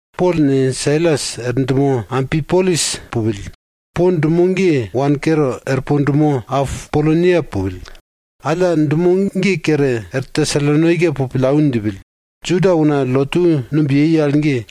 Pol ne, Sailas er dumo Ampipolis pupill. Po dumo ge wane kere er po dumo Apolonia pupill. Alla dumo ge kere er Tesalonaika po pillau djipill. Juda una lotu numb yei al ge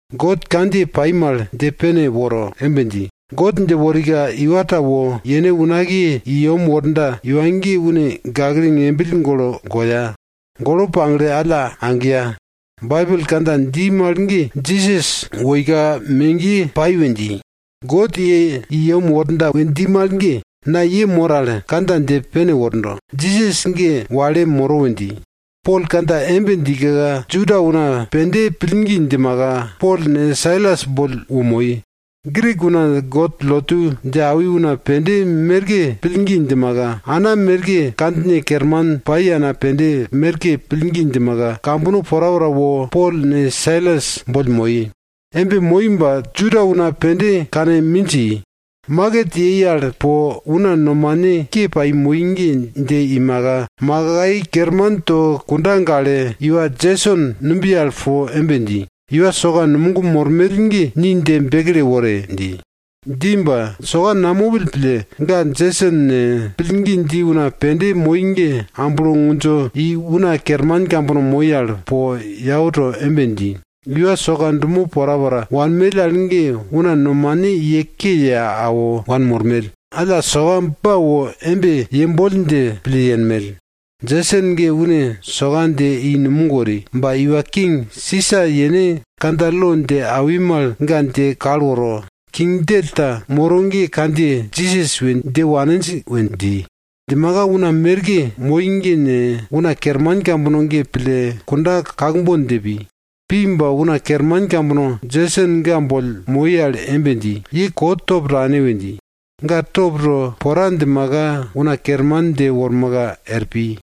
God kandjiye pai mal dje pene woro embe dji, God dje worika iwa ta wo yene unakiye i yem worda iwa ge une gakle ngembill golo goya. Golo pagle alla agiya. Baibel kandja dji mal ge Jisas woika megiye toi we dji. God ye i yem worda we dji mal ge, na ye mor al kandja dje pene wordo, Jisas ge wale moro we dji. Pol kandja embe djika Juda una pende pillgi djimaka, Pol ne, Sailas boll wo moi, Grik una God lotu dje awi una pende merke pillgi djimaka, ana merke kandjine kerman pai ana pende merke pillgi djimaka, kambono porapora wo Pol ne Sailas boll moi. Embe moi ba Juda una pende kane minj i, maket yei al po una nomane ke pai moi ge dje iumaka, makai kerman to kunda gale, iwa Jeson numbiye al po embe dji, iwa soka numog mormell ge ni dje bekle wore! dji. Dji ba soka namopill pille, ga Jeson ne, pillgi dji una pende moi ge amblo ngundjo i una kerman kambono moi al po yau to embe dji, iwa soka dumo porapora wanmell al ge una nomane ye ke ye awo wanmormell. Alla soka ba wo embe yemboll dje pille yenmell. Jeson ge une soka dje i numog wori. Ba iwa king Sisa yene kandja lo dje awi mal ga dje kal woro, king djell ta moro ge kandjiye Jisas we dje waninj we dji. Djimaka una merke moi ge ne, una kerman kambono ge pille kunda kakbon dje pi. Pi ba una kerman kambono Jeson ga boll moi al embe dji, ye kot top tane we dji. Ga top to pora djimaka una kerman dje wormaka er pi.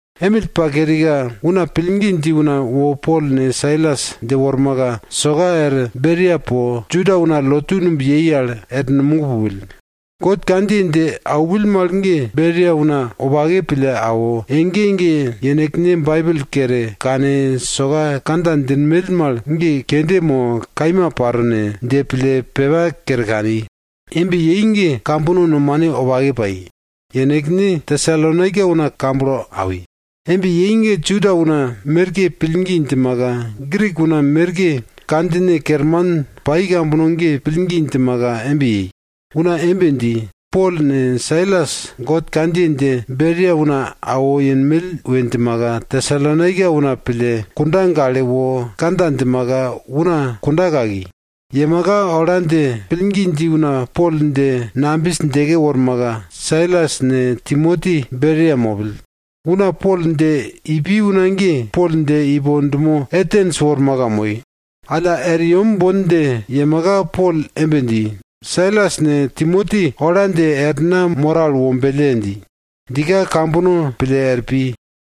Emill pa kerika, una pillgi dji una wo Pol ne, Sailas dje wormaka, soka er Beria po, Juda una lotu numb yei al er numog pupill. God kandjiye dje aupill mal ge Beria una wopake pille awo, ege ege yenekne Baibel kere kane soka kandja djinmell mal ge kende mo kaima paro ne? dje pille pepa kere kani. Embe yei ge kambono nomane wopake pai. Yenekne Tesalonaika una kamblo awi. Embe yei ge Juda una merke pillgi djimaka, Grik una merke kandjine kerman pai kambono ge pillgi djimaka embe yei. Una embe dji, Pol ne, Sailas God kandjiye dje Beria una awo yenmell we djimaka, Tesalonaika una pille, kunda gale wo kandja djimaka, una kunda kaki. Yemaka ola dje pillgi dji una Pol dje nambis djeke wormaka, Sailas ne, Timoti Beria mopill. Una Pol dje ipi una ge Pol dje ipo dumo Atens wormaka moi. Alla er yem bon dje yemaka, Pol embe dji, Sailas ne, Timoti ola dje er na moro al wombelle! dji. Djika kambono pille er pi.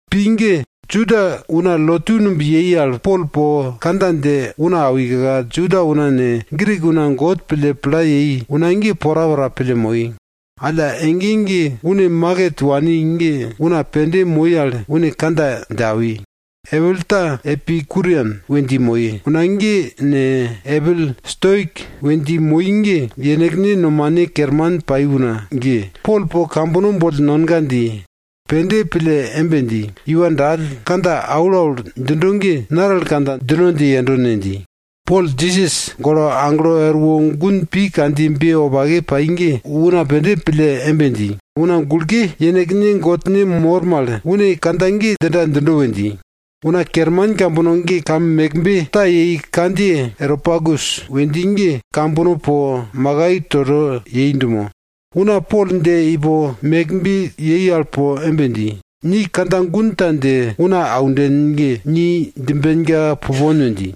Pi ge Juda una lotu numb yei al Pol po kandja dje una awika, Juda una ne, Grik una God pille pla yei una ge porapora pille moi. Alla ege ege une maket wani ge una pende moi al une kandja dje awi. Epil ta Epikurian we dji moi una ge ne, epil Stoik we dji moi ge yenekne nomane kerman pai una ge, Pol po kambono boll nonga dji. Pende pille embe dji, iwa dall, kandja aulaul djindo ge naral kandja djino dje yendo ne? dji. Pol Jisas golo aglo erwo gun pi kandjiyebe wopake pai ge, una pende pille embe dji, una gulke yenekne godne mor mal, une kandja ge djinda djindo we dji. Una kerman kambono ge kam mekbe ta yei kandjiye Areopagus we dji ge kambono po makai toto yei dumo. Una Pol dje ipo mekbe yei al ge po embe dji, ni kandja gun ta dje una aunden ge, ni djimbenka pupon we dji.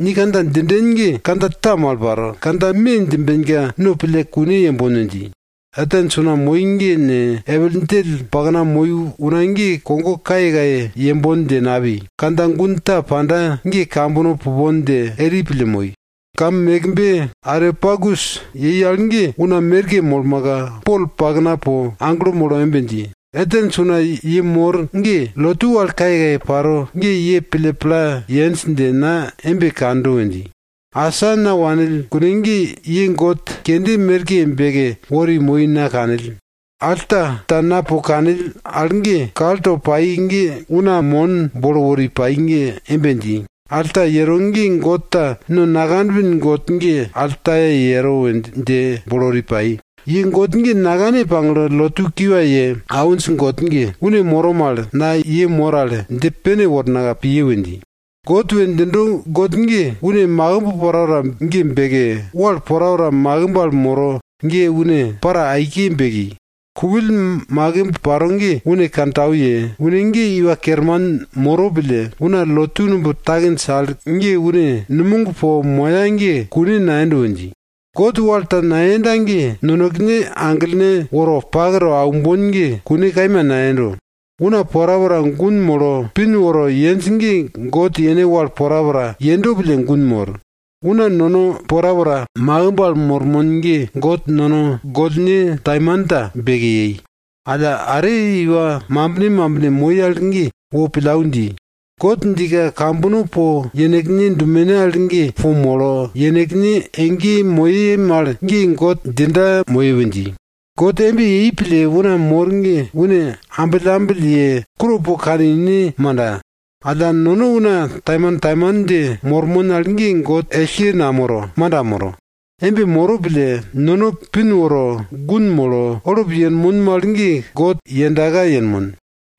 Ni kandja djinden ge kandja ta mal paro. Kandja me djimbena no pille kune yembon we dji. Atens una moi ge ne, epil djell pakna moi una ge kogo kayekaye yembon dje napi, kandja gun ta panda ge kambono pupon dje eri pille moi. Kam mekbe Areopagus yei al ge una merke molmaka, Pol pakna po aglo molo embe dji, Atens una ye mor ge, lotu wal kayekaye paro ge ye pille pla yenj dje na embe kando we dji. Asa na wanill kune ge ye god kende merke beke wori moi na kanill. Alta ta na po kanill al ge, kal to pai ge una mon bolo wori pai ge embe dji, alta yero ge god ta no nakanpin god ge altaye yero we dje bolo wori pai. Ye god ge nakane pagle, lotu kiwa ye awinj god ge, une moro mal, na ye mor al dje pene wornaka piye we dji. God we djindo god ge, une makimb porapora ge beke, wal porapora makimb al moro ge une para aike beki. Kupill makimb paro ge une kantau ye, une ge iwa kerman moro pille, una lotu numb takinj al ge une numog po moya ge kune nayendo we dji. God wal ta nayenda ge, nonekene aglene woro pak to aumbon ge kune kaima nayendo. Una porapora gun molo, pin woro yenj ge God yene wal porapora yendo pille gun mor. Una nono porapora makimb al mormon ge God nono gollne taimanta beke yei. Alla are iwa mambine mambine moi mal ge wo pillau dji. God djika kambono po yenekne dumene al ge po molo, yenekne ege moye mal ge God djinda moye we dji. God embe yei pille una mor ge une ambillambill ye kuro po kane ine manda? Alla, nono una taimantaiman dje mormon al ge God ellke namoro, manda moro. Embe moro pille, nono pin woro, gun molo, olup yenmon mal ge God yendaka yenmon.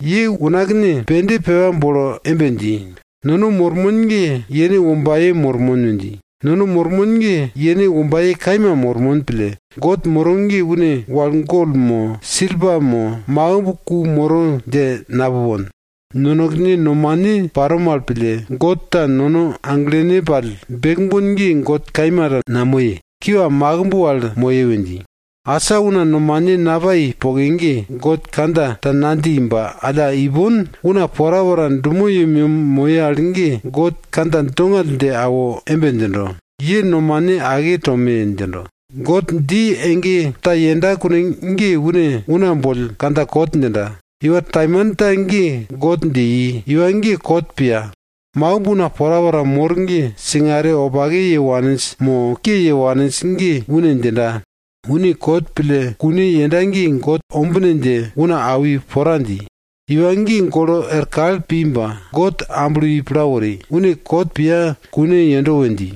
Ye unakne pende pepa bolo embe dji, nono mormon ge yene wombaye mormon we dji. Nono mormon ge yene wombaye kaima mormon pille, God moro ge une wal gol mo, silpa mo, makimb ku moro dje napupon. Nonekene nomane paro mal pille, god ta nono aglene pall bekbon ge god kaima ta namoye, kiwa makimb wal moye we dji. Asa una nomane napai poke ge, God kandja ta nadji ba alla, ipon una porapora dumo yemyem moye al ge God kandja dongall dje awo embe djindo, ye nomane ake tome! djindo. God dji ege ta yenda kune ge une una boll kandja kot djinda. Iwa taimanta ge God dje i. Iwa ge kot piya. Makimb una porapora mor ge singare wopake ye waninj mo ke ye waninj ge une djinda. Une kot pille kune yenda ge God ombine dje una awi pora dji. Iwa ge golo er kal pi ba, God amblo i pla wori, une kot piya kune yendo we dji.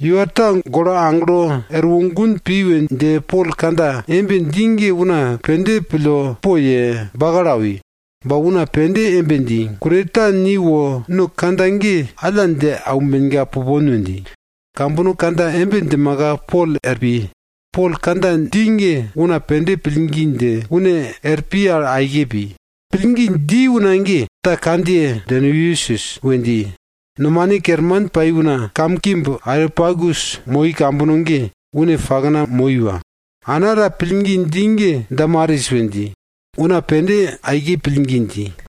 Iwa ta golo aglo erwo gun pi we dje Pol kandja embe dji ge una pende pille poye, bakalo awi. Ba una pende embe dji, kune ta ni wo no kandja ge alla dje aumbenka pupon we dji. Kambono kandja embe djimaka Pol er pi. Pol kandja dji ge una pende pillgi dje, une er pi al aike pi. Pillgi dji una ge ta kandjiye Dyonisius we dji. Nomane kerman pai una kam mekbe Areopagus moi kambono ge une pakna moi iwa. Ana ta pillgi dji ge Damaris we dji, una pende aike pillgi dji.